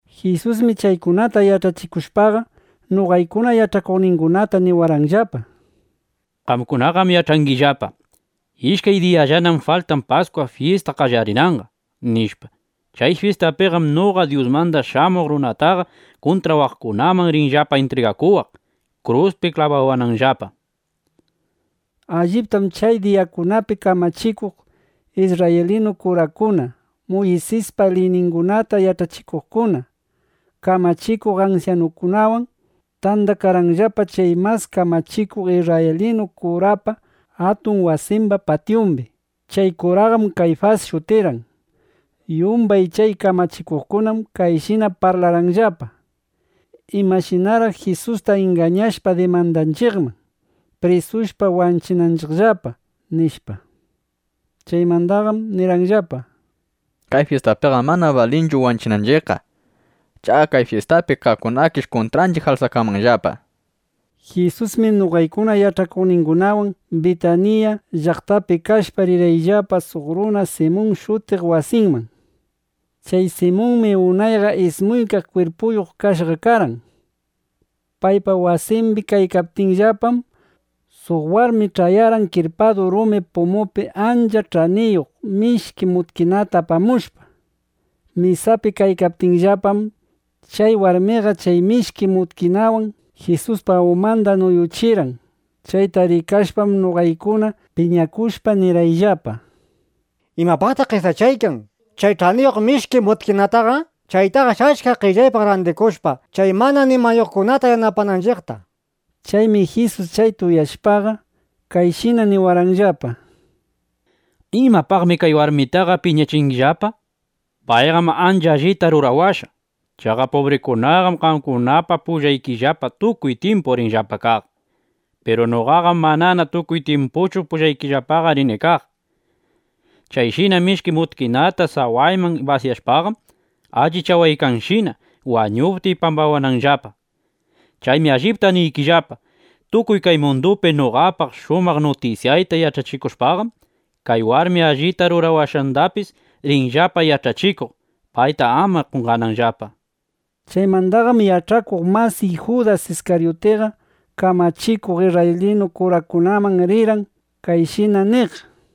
Jisusmi chaykunata yach'achikushpaqa, noqaykuna yach'akuqningunata niwarqanllapa: —Qamkunaqam yach'angillapa: Ishkay diyallanam faltan Paskwa fyista qallarinanqa, nishpa. Chay fyistapim noqa Dyusmanda Shamuq Runataqa kuntrawaqkunaman rinllapa intrigakuwaq, kruspi klabawananllapa, nishpa. Alliptam chay diyakunapi kamachikuq isrraylinu kurakuna, Muysispa liyningunata yach'achikuqkuna, kamachikuq ansyanukunawan tandakarqanllapa chay mas kamachikuq isrraylinu kurapa atun wasimba patyumbi. Chay kuraqam Kayfas shutirqan. Yumbay chay kamachikuqkunam kayshina parlarqanllapa: —¿Imashinaraq Jisusta ingañashpa dimandanchiqman, prisushpa wanchinanchiqllapa? nishpa. Chaymandaqam nirqanllapa: —Kay fyistapiqam mana balinchu wanchinanchiqqa. Chaqa kay fyistapi kaqkunakish kuntranchiq alsakanmanllapa, nishpa. Jisusmi noqaykuna yach'akuqningunawan Bitanilla (Bitaniya) llaqtapi kashpa, rirqayllapa suq runa Simun shutiqpa wasinman. Chay Simunmi unayqa ismuykaq kwirpuyuq kashqa karqan. Paypa wasimbi kaykaptiyllapam, suq warmi ch'ayarqan kirpadu rumi pumupi ancha ch'aniyuq mishki mutkinata apamushpa. Mesapi kaykaptiyllapam, chay warmiqa chay mishki mutkinawan Jisuspa umanda nuyuchirqan. Chayta rikashpam, noqaykunaqa piñakushpa, nirqayllapa: —¿Imapaqtaq qesachaykan chay ch'aniyuq mishki mutkinataqa? Chaytaqash' achka qellaypaq randikushpa, chay mana nimayuqkunata yanapananchiqta, nishpa. Chaymi Jisus chayta uyashpaqa, kayshina niwarqanllapa: —¿Imapaqmi kay warmitaqa piñachingillapa? Payqam ancha allita rurawashqa. Chaqa pubrikunaqam qamkunapa pullaykillapa tukuy tyimpu rinllapa kaq. Piru noqaqam manana tukuy tyimpuchu pullaykillapaqa rini kaq. Kayshina mishki mutkinata sawayman basyashpaqam, allichawashqashina, wañuptiy pambawananllapa. Chaymi allipta niykillapa, tukuy kay mundupi noqapa shumaq nutisyayta yach'achikushpaqam, kay warmi allita rurawashqandapis rinllapa yach'achikuq, payta ama qonqananllapa, nishpa. Chaymandaqam yach'akuq masiy Judas Iskaryutiqa kamachikuq isrraylinu kurakunaman rirqan kayshina niq: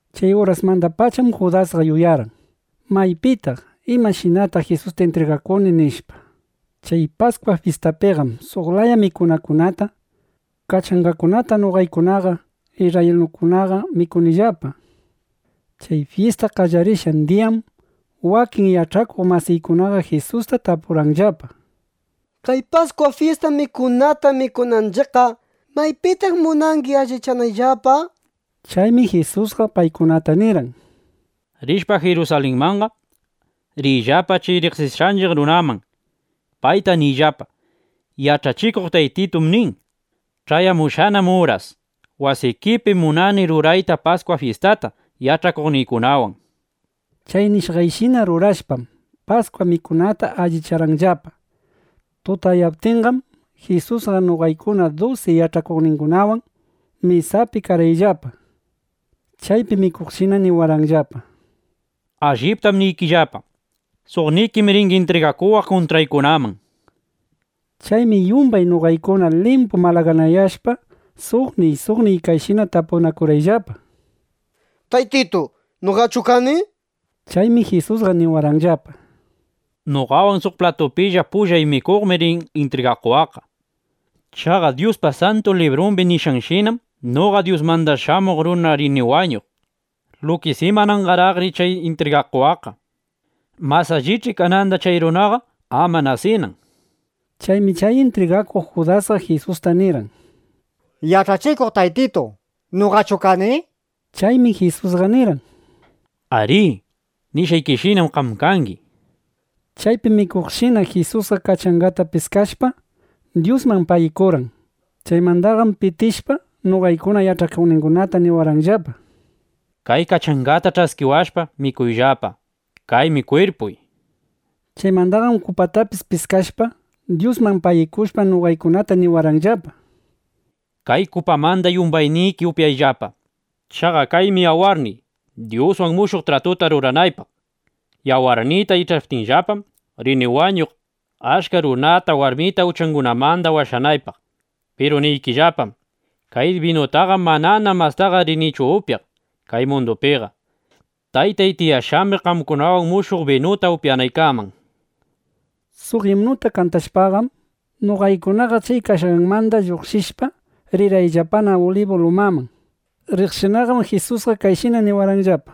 Chay urasmandapacham Judasqa yuyarqan: ¿Maypitaq, imashinataq Jisusta intrigakuni? nishpa. Chay Paskwa fyistapiqam suq laya mikunakunata, kachangakunata noqaykuna isrraylinukunaqa mikunillapa. Chay fyista qallarishqan diyam wakin yach'akuq masiykunaqa Jisusta tapurqanllapa: —Kay Paskwa fyista mikunata mikunanchiqqa, ¿maypitaq munangi allichanayllapa? nishpa. Chaymi Jisusqa paykunataqa nirqan: —Rishpa Jirusalinmanqa, riyllapa chay riqsishqanchiq runaman. Payta niyllapa: “Yach'achikuq Taytitum nin: Ch'ayamushqanam uras. Wasikipim munani rurayta Paskwa fyistata yach'akuqniykunawan”, nishpa. Chay nishqanshina rurashpam, Paskwa mikunata allicharqanllapa. Tutayaptinnaqam, Jisusqa noqaykuna dusi yach'akuqningunawan mesapina karqayllapa. Chaypi mikuqshinam niwarqanllapa: —Alliptam niykillapa, suqnikim ringi intrigakuwaq kuntrawaqkunaman, nishpa. Chaymi yumbay noqaykuna limpu malaganayashpa, suqniy suqniy kayshina tapurqayllapa: —Taytitu, ¿noqachu kani? nishpallapa. Chaymi Jisusqa niwarqanllapa: —Noqawan suq platupilla pullay mikuqmi rin intrigakuwaqqa. Chaqa Dyuspa Santu Librun nishqanshinam noqa Dyusmanda Shamuq Runaqa rini wañuq. Lukis ¡imananqaraqri chay intrigakuwaqqa! Mas allich'i kananda chay runaqa ama nasinambaq, nishpa. Chaymi chay intrigakuq Judasqa Jisusta nirqan: —Yach'achikuq Taytitu, ¿noqachu kani? nishpa. Chaymi Jisusqa nirqan: —Arí, nishqaykishinam qam kangi, nishpa. Chaypi mikuqshinam Jisusqa kachangata piskashpa, Dyusman pagikurqan. Chaymandaqam pitishpa, noqaykuna yach'akuqningunata niwarqanllapa: —Kay kachangata ch'askiwashpa, mikuyllapa. Kaymi kwirpuy, nishpa. Chaymandaqam kupatapis piskashpa, Dyusman pagikushpa, noqaykunata niwarqanllapa: —Kay kupamanda yumbayniki upyayllapa. Chaqa kaymi yawarniy, Dyuswan mushuq tratuta ruranaypaqqa. Yawarniyta ich'aptinllapam rini wañuq, achka runata, warmita uchangunamanda washanaypaq. Piru niykillapam, kay binutaqam manana mastaqa rinichu upyaq kay mundupiqa, Taytay tiyashqambi qamkunawan mushuq binuta upyanaykaman, nishpa. Suq imnuta kantashpaqam, noqaykunaqa chay kashqaymanda lluqshishpa, rirqayllapana Ulibu lumaman. Riqshinaqam Jisusqa kayshina niwarqanllapa: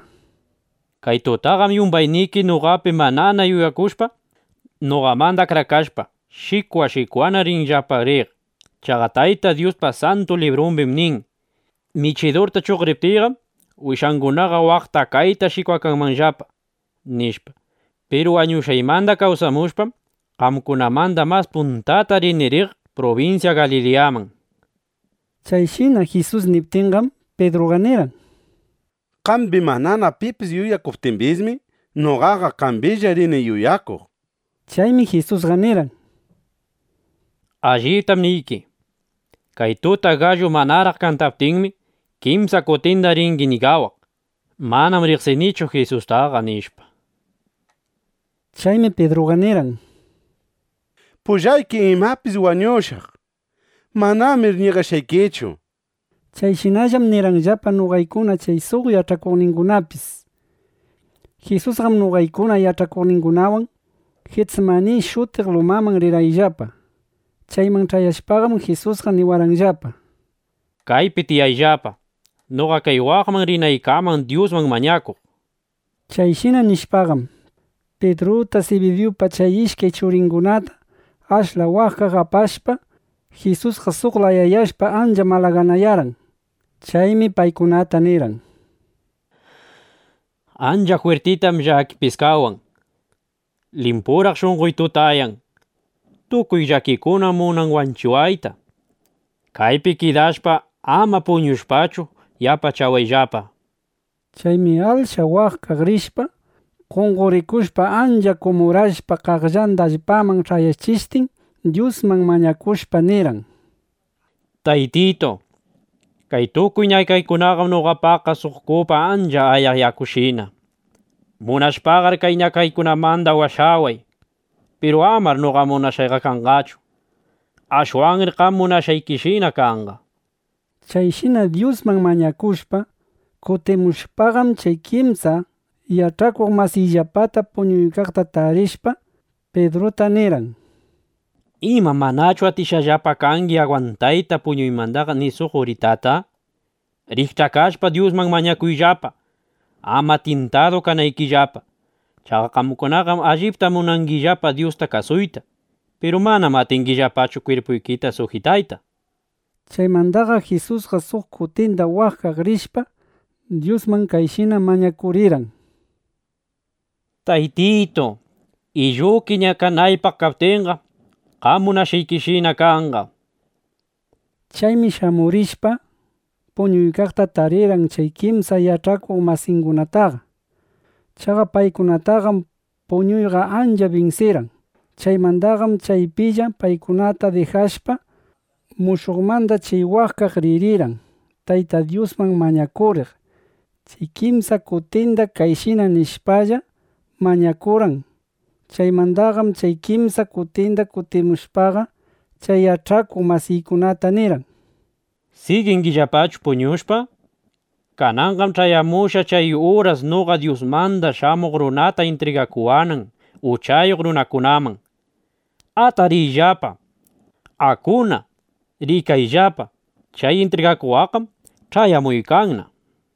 —Kay tutaqam yumbayniki noqapi manana yuyakushpa, noqamanda akrakashpa, shikwa shikwana ringillapa riq. Chaqa Tayta Dyuspa Santu Librumbim nin: “Michidurta chuqriptiyqam, wishangunaqa waqta kayta shikwakanqallapa”, nishpa. Piru wañushqaymanda kawsamushpam, qamkunamanda mas puntata rini riq prubinsya Galiliyaman, nishpa. Chayshina Jisus niptinqam, Pidruqa nirqan: —Qambi manana pipis yuyakuptimbismi, noqaqa qambilla rini yuyakuq, nishpa. Chaymi Jisusqa nirqan: —Alliptam niyki, kay tuta gallu manaraq kantaptinmi, kimsa kutinda ringi ñigawaq: “Manam riqsinichu Jisustaqa”, nishpa. Chaymi Pidruqa nirirqan: —Pullayki imapis wañushaq. Manamir ñigashqaykichu, nishpa. Chayshinallam nirqayllapa noqaykuna chay suq yach'akuqningunapis. Jisusqam noqaykuna yach'akuqningunawan Jitsimani shutiq lugarman rirqanillapa. Chayman ch'ayashpaqam, Jisusqa niwarqanllapa: —Kaypi tiyayllapa, noqa kay waqman rinaykaman Dyusman mañakuq, nishpa. Chayshina nishpaqam, Pidruta, Sibidiyupa chay ishkay churingunata ashla waqkaq apashpa, Jisusqa suq layayashpa, ancha malaganayarqan. Chaymi paykunata nirqan: —Ancha jwirtitam llaki piskawan. Limpuraq shunqoy tutayan. Tukuy kay llakikunam munan wanchiwayta. Kaypi kidashpa, ama puñushpachu, yapachawayllapa, nishpa. Chaymi ashla waqkaq rishpa, qonqorikushpa, ancha kumurashpa qaqllan allpaman ch'ayachishtin, Dyusman mañakushpa, nirqan: —Taytitu, kay tukuy ñakaykunaqam noqapaqqa suq kupa ancha ayaq yakushina. Munashpaqar chay ñakaykunamanda washaway. Piru amar noqa munashqayqa kanqachu. Ashwanri qam munashqaykishina kanqa, nishpa. Chayshina Dyusman mañakushpa, kutimushpaqam, chay kimsa yach'akuq masiyllapata puñuykaqta tarishpa, Pidruta nirqan: —¿Ima manachu atishqallapa kangi agwantayta puñuymandaqa ni suq uritata? Rikch'akashpa, Dyusman mañakuyllapa, ama tyintadu kanaykillapa. Chaqa qamkunaqam allipta munangillapa Dyusta kasuyta. Piru manam atingillapachu kwirpuykita sujitayta, nishpa. Chaymandaqam Jisusqa suq kutinda waqkaq ririshpa, Dyusman kayshina mañakurirqan: —Taytitu, illuki ñakanaypaq kaptinqa, qam munashqaykishina kanqa, nishpa. Chaymi shamurishpaqa, puñuykaqta taririrqan chay kimsa yach'akuq masiykunataqa. Chaqa paykunataqam puñuyqa ancha binsiykarqan. Chaymandaqam chaypilla paykunata dijashpa, mushuqmanda chay waqkaq ririrqan, Tayta Dyusman mañakuriq. Chay kimsa kutindam chayshina nishpalla, mañakurqan. Chaymandaqam chay kimsa kutinda kutimushpaqa, chay yach'akuq masiykunataqa nirqan: —¿Sigingillapachu puñushpa? Kananqam ch'ayamushqa chay uras noqa Dyusmanda Shamuq Runata intrigakuwanan uchayuq runakunaman. Atariyllapa. Akuna. Rikayllapa, chay intrigakuwaqqam ch'ayamuykanna, nishpa.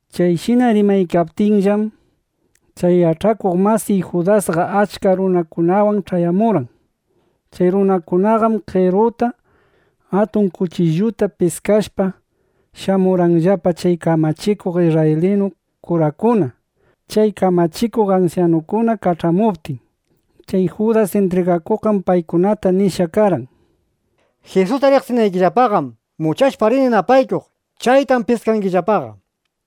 Chayshina rimaykaptinllam, chay yach'akuq masiy Judasqa achka runakunawan ch'ayamurqan. Chay runakunaqam qeruta, atun kuchilluta piskashpa, shamurqanllapa chay kamachikuq isrraylinu kurakuna, chay kamachikuq ansyanukuna kach'amuptin. Chay Judas intrigakuqqam paykunataqa nishqa karqan: —Jisusta riqsinaykillapaqam, muchashpa rini napaykuq. Chaytam piskangillapaqa, nishpa.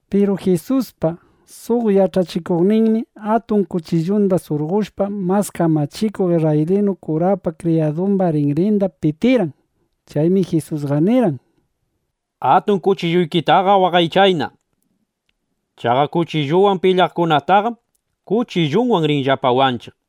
Piru Jisuspa suq yach'akuqninmi atun kuchillunda surqoshpa, mas kamachikuq isrraylinu kurapa kriyadumba rinrinda pitirqan. Chaymi Jisusqa nirqan: —Atun kuchilluykitaqa waqaychayna. Chaqa kuchilluwan pilyaqkunataqam, kuchilluwan rinllapa wanchiq.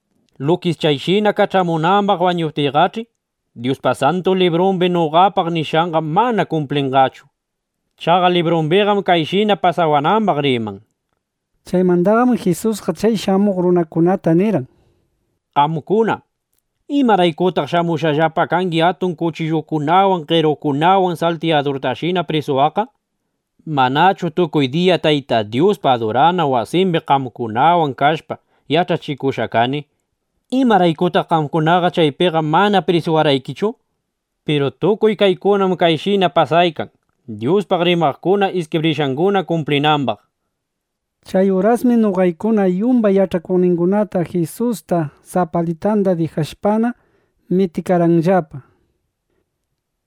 Lukis chayshina kach'amunambaq mañaptiyqach'i, Dyuspa Santu Librumbi noqapaq nishqanqa mana kumplinqachu. Chaqa librumbiqam kayshina pasawanambaq riman, nishpa. Chaymandaqam Jisusqa chay shamuq runakunata nirqan: —Qamkunaqa, ¿imaraykutaq shamushqallapa kangi atun kuchillukunawan, qerukunawan, saltiyadurtashina prisuwaqqa? Manchu tukuy diya Tayta Dyuspa adurana wasimbi qamkunawan kashpa, yach'achikushqa kani. ¿Imaraykutaq qamkunaqa chaypiqa mana prisuwarqaykichu? Piru tukuy kaykunam kayshina pasaykan, Dyuspaq rimaqkuna iskibrishqanguna kumplinambaq, nishpa. Chay urasmi noqaykuna yumbay yach'akuqningunaqa Jisusta sapalitanda dijashpana, mitikarqayllapa.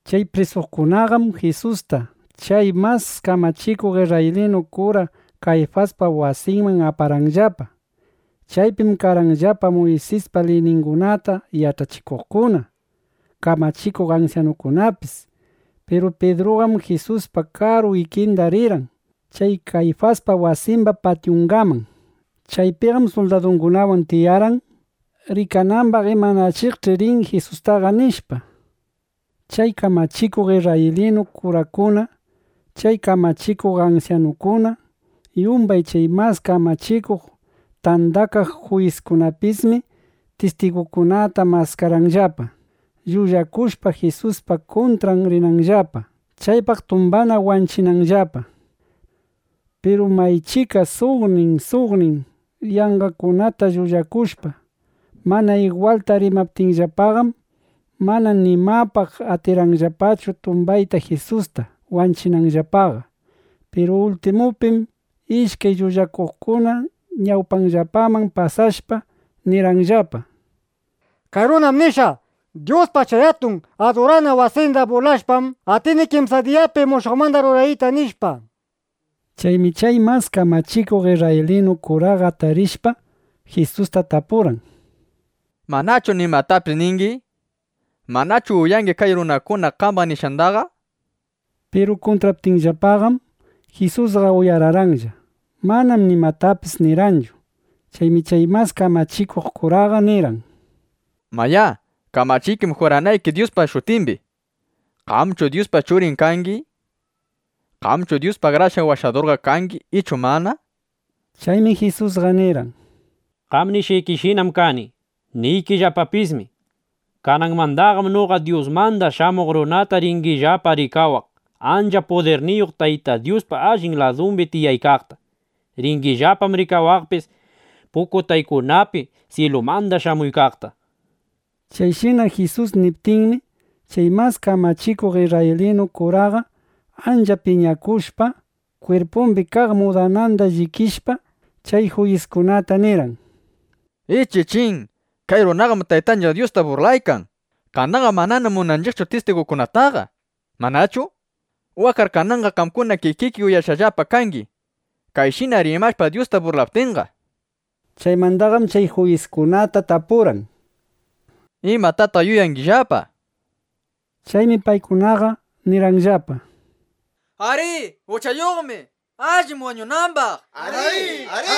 Chay prisuqkunaqam Jisustaqa chay mas kamachikuq isrraylinu kura Kayfaspa wasinman aparqanllapa. Chaypim karqanllapa Muysispa liyningunata yach'achikuqkuna, kamachikuq ansyanukunapis. Piru Pidruqam Jisuspa karu ikinda rirqan chay Kayfaspa wasimba patyungaman. Chaypiqam suldadukunawan tiyarqan, rikanambaq imanachiqshi rin Jisustaqa, nishpa. Chay kamachikuq isrraylinu kurakuna, chay kamachikuq ansyanukuna, yumbay chay Mas Kamachikuq Tandakaq Juyiskunapismi tistigukunata maskarqanllapa, llullakushpa, Jisuspa kuntran rimananllapa, chaypaq tumbanna wanchinanllapa. Piru maychika suqnin suqnin yanqakunata llullakushpa, mana igwalta rimaptinllapaqam, mana nimapaq atirqanllapachu tumbayta Jisusta, wanchinanllapaqa. Piru ultimupim ishkay llullakuqkuna ñawpanllapaman pasashpa, nirqanllapa: —Kay runam nishqa: “Dyuspa chay atun adurana wasinda bulashpam, atini kimsa diyapi mushuqmanda rurariyta”, nishpa. Chaymi chay mas kamachikuq isrraylinu kuraqa atarishpa, Jisusta tapurqan: —¿Manachu nimatapis ningi? ¿Manachu uyangi kay runakuna qambaq rimashqandaqa? nishpa. Piru kuntraptinllapaqam, Jisusqa uyararqanlla. Manam nimatapis nirqanchu. Chaymi chay mas kamachikuq kuraqa nirqan: —Mayá, kamachiykim juranayki Dyuspa shutimbi, ¿Qamchu Dyuspa Churin kangi? ¿Qamchu Dyus Akrashqan Washadurqa kangi ichu mana? nishpa. Chaymi Jisusqa nirqan: —Qam nishqaykishinam kani. Niykillapapismi, kananmandaqam noqa Dyusmanda Shamuq Runata ringillapa rikawaq, ancha pudirniyuq Tayta Dyuspa allin ladumbi tiyaykaqta. Ringillapam rikawaqpis pukutaykunapi syilumanda shamuykaqta, nishpa. Chayshina Jisus niptinmi, chay mas kamachikuq isrraylinu kuraqa ancha piñakushpa, kwirpumbi kaq mudananda llikishpa, chay juyiskunata nirqan: —¡Ichichín, kay runaqam Taytanchiq Dyusta burlaykan! Kananqam manana munanchiqchu tistigukunataqa, ¿manachu? Waqqar kananqa qamkuna kikiki uyashqallapa kangi, kayshina rimashpa Dyusta burlaptinqa. Chaymandaqam chay juyiskunata tapurqan: —¿Imatataq yuyangillapa? nishpa. Chaymi paykunaqa nirqanllapa: —Arí, uchayuqmi. Allim wañunambaq, nishpa.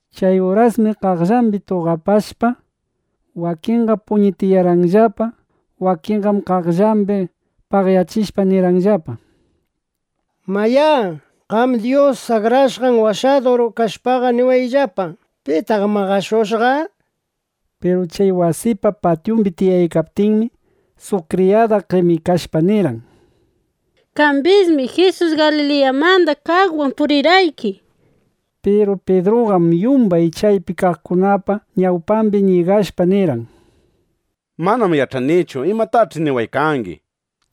Chay urasmi qaqllambi tuqapashpa, wakinqa puñitiyarqanllapa, wakinqam qaqllambi paqyachishpa, nirqanllapa: —Mayá, qam Dyus Akrashqan Washadur kashpaqa, niwayllapa: ¿Pitaq maqashushqa? nishpa. Pidru chay wasipa patyumbi tiyaykaptinmi, suq kriyada qemikashpa nirqan: —Qambismi Jisus Galiliyamanda kaqwan purirqayki, nishpa. Piru Pidruqam yumbay chaypi kaqkunapa ñawpambi ñigashpa nirqan: —Manam yach'anichu imatach'i niwaykangi, nishpa.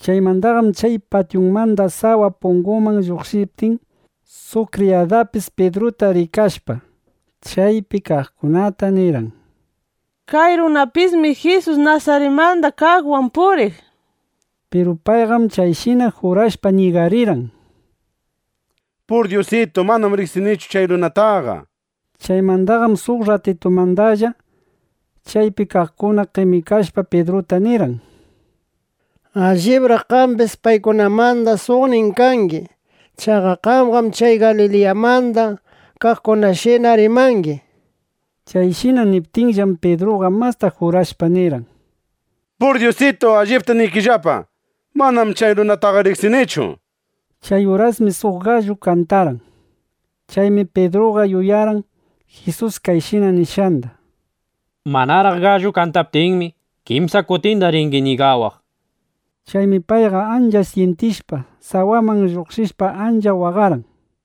Chaymandaqam chay patyumanda sawa punguman lluqshiptin, suq kriyadapis Pidruta rikashpa, chaypi kaqkunata nirqan: —Kay runapismi Jisus Nasaritmanda kaqwan puriq, nishpa. Piru payqam kayshina jurashpa, ñigarirqan: —Pur Dyusitu, manam riqsinichu chay runataqa, nishpa. Chaymandaqam suq rratitumandalla, chaypi kaqkuna qemikashpa, Pidruta nirqan: —Allibraq qambis paykunamanda suqnin kangi. Chaqa qamqam chay Galiliyamanda kaqkunashina rimangi, nishpa. Chayshina niptinllapam, Pidruqa masta jurashpa, nirqan: —¡Pur Dyusitu, allipta niykillapa, manamir chay runataqa riqsinichu! nishpa. Chay urasmi suq gallu kantarqan. Chaymi Pidruqa yuyarqan Jisus kayshina nishqanda: “Manaraq gallu kantaptinmi, kimsa kutinda ringi ñigawaq”, nishpa. Chaymi payqa ancha syintishpa, sawaman lluqshishpa, ancha waqarqan.